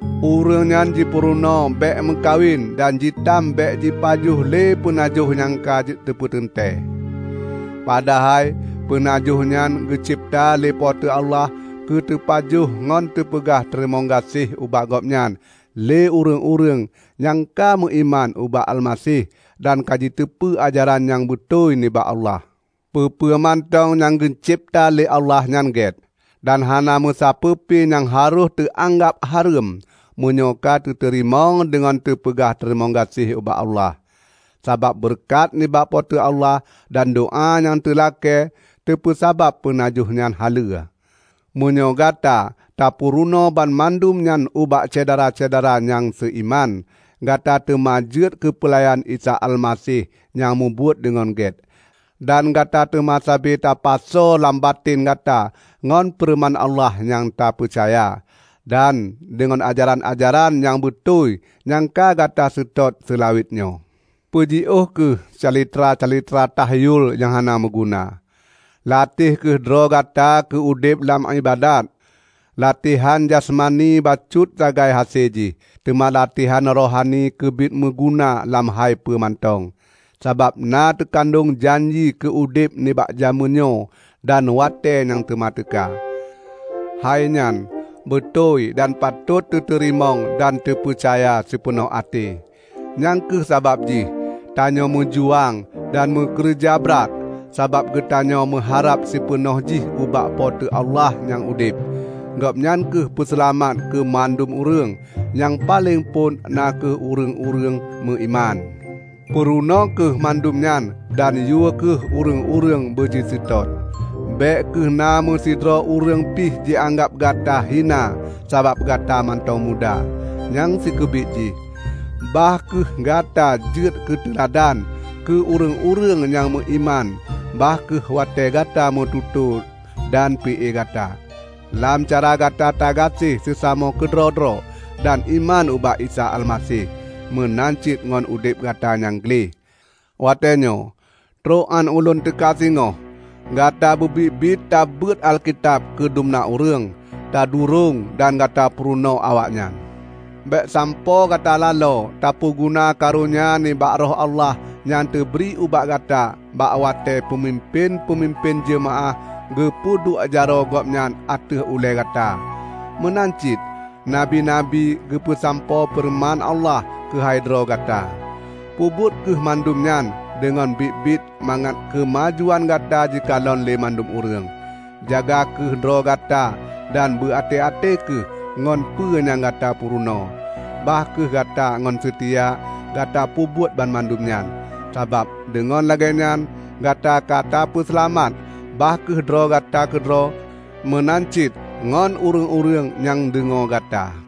Ureuëng nyan jipeurunoe bék meukawen dan jitam bék jipajoh lé peunajoh nyang ka jipeuteuntée. Padahai peunajoh nyan geucebta lé Po teu Allah keuteupajoh ngon teupeugah teurimong gaséh ubak Gobnyan lé ureuëng-ureuëng nyang ka meuiman ubak Almaseh dan ka jiteupeue ajaran nyang beutôi nibak Allah. Peue-peue mantong nyang geucebta lé Allah nyan gét, dan hana meusapeue pi nyang harôh teuanggab hareuem meunyoe ka teuteurimong deungon teupeugah teurimong gaséh ubak Allah. Sabab beureukat nibak Po teu Allah dan doá nyang teulakée teupeusabab peunajoh nyan haleue. Meunyoe gata tapeurunoe banmandum nyan ubak syedara-syedara nyang seuiman, gata teuma jeuet keupeulayan Isa Almaseh nyang mubuet deungon gét. Dan gata teuma sabe tapasoe lam baten gata ngon feureuman Allah nyang tapeucaya, dan deungon ajaran-ajaran nyang beutôi nyang ka gata seutôt seulawet nyoe. Peujiôh kheueh calitra-calitra tahyul nyang hana meuguna. Lateh kheueh droe gata keu udeb lam iébadat. Latehan jasmani bacut sagai hase jih, teuma latehan rohani keubiet meuguna lam hai peue mantong, sabab na teukandong janji keu udeb nibak jamén nyoe dan watée nyang teuma teuka. Hainyan beutôi dan patot teuteurimong dan teupeucaya sipeunoh até. Nyang kheueh sabab jih tanyoe meujuang dan meukeureuja brat, sabab geutanyoe meuharab sipeunoh jih ubak Po teu Allah nyang udeb; Gobnyan kheueh Peuseulamat keu mandum ureuëng, nyang paleng phon na kheueh ureuëng-ureuëng meuiman. Peurunoe kheueh mandum nyan dan yue kheueh ureuëng-ureuëng beujiseutôt. Bék kheueh na meusidroe ureuëng pih jianggab gata hina sabab gata mantong muda. Nyang sikeubiet jih, bah kheueh gata jeuet keuteuladan keu ureuëng-ureuëng nyang meuiman bah kheueh watée gata meututoe dan pi-e gata, lam cara gata tagaséh seusamoe keudroe-droe dan iman ubak Isa Almaseh, meunan cit ngon udeb gata nyang gleh. Watée nyoe, trok án ulôn teuka singoh, gata beubiet-biet tabeuet Alkitab keu dumna ureuëng, tadurong dan gata purunoe awaknyan. Bék sampoe gata laloe tapeuguna karonya nibak Roh Allah nyang teubri ubak gata bak watée peumimpén-peumimpén jeumaáh geupeuduek jaroe gobnyan ateueh ulée gata, meunan cit nabi-nabi geupeusampoe feureuman Allah keuhai droe gata. Peubuet kheueh mandum nyan deungon biet-biet mangat keumajuan gata jikalon lé mandum ureuëng. Jaga kheueh droe gata dan beu até-até kheueh ngon peue nyang gata peurunoe. Bah kheueh gata ngon seutia gata peubuet banmandum nyan, sabab deungon lagée nyan gata ka tapeuseulamat bah kheueh droe gata keudroe meunan cit ngon ureuëng-ureuëng nyang deungoe gata.